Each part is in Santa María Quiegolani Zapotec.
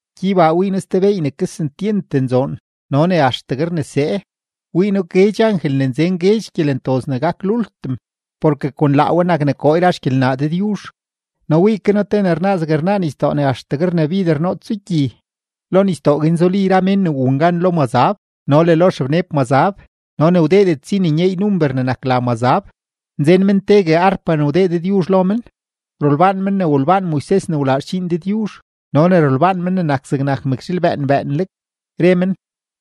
Gyeybaa wii noo ste beey ne kesentyent nzoon no ne axtegue rnesee: wii noo guedx angel ne nzen guedx gyelentoz ne gak lultim, porke kon laa we nak ne koo yra xgyelnaa Dëdyuzh. No wii ke noo te ne rnaa zeg rnaa nisdoo ne axtegue rnabider nootso gyi; lo nisdoo guin zuli yra mén ne wun gan lo mazab no le lo xebneb mazab no ne wdeedet si nyeey number ne nak la mazab; nzen men tegue arpa ne wdee Dëdyuzh lo men. Rolbaan men ne wolbaan Moises ne wlaa xdxiin Dëdyuzh no ne rolbaan Men ne nak zegnak mëkzhiil bëën bëënleg, re men: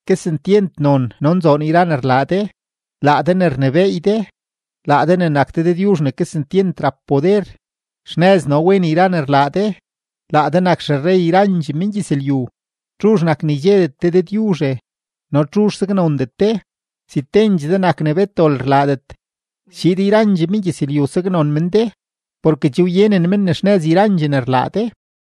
Kesentyent non no nzoon yra ne rlaa de, laa de ne rnebééy de, laa de ne nak de Dëdyuzh ne kesentyent rap poder, xnëz no wen yra ne rlaa de, laa de nak xerrey yrandxee mengyëzlyu. ¿Txuzh nak ne ydxedet de Dëdyuzhe, no txuzh saknondet de? Si tendxee de nak ne bet dol rlaadet, schiid yrandxee mengyëzlyu saknon men de porke che wyenen men ne xnëz yrandxee ne rlaa de.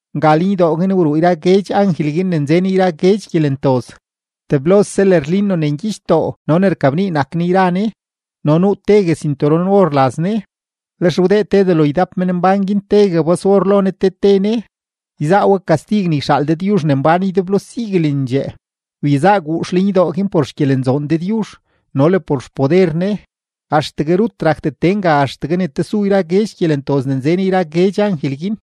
Nga lenydoo guin wruu yra guedx angel guin ne nzen yra guedx gyelentoz; teblose lërlino ne ngyichdoo no ne rkabnii nak ne yra ne, no nuu tegue sinturon-or laz ne. Lex wdee te delo ydap menmbán guin tegue bas-or lo ne te te ne, yzaa we kastig ne yxaal Dëdyuzh ne mbán ydeblo siguelendxee. Wyezaa guux lenydoo guin por xgyelenzoon Dëdyuzh no le por xpoder Ne, axtegue rut rakdet tee nga axtegue ne tesu yra guedx gyelentoz ne nzen yra guedx angel guin.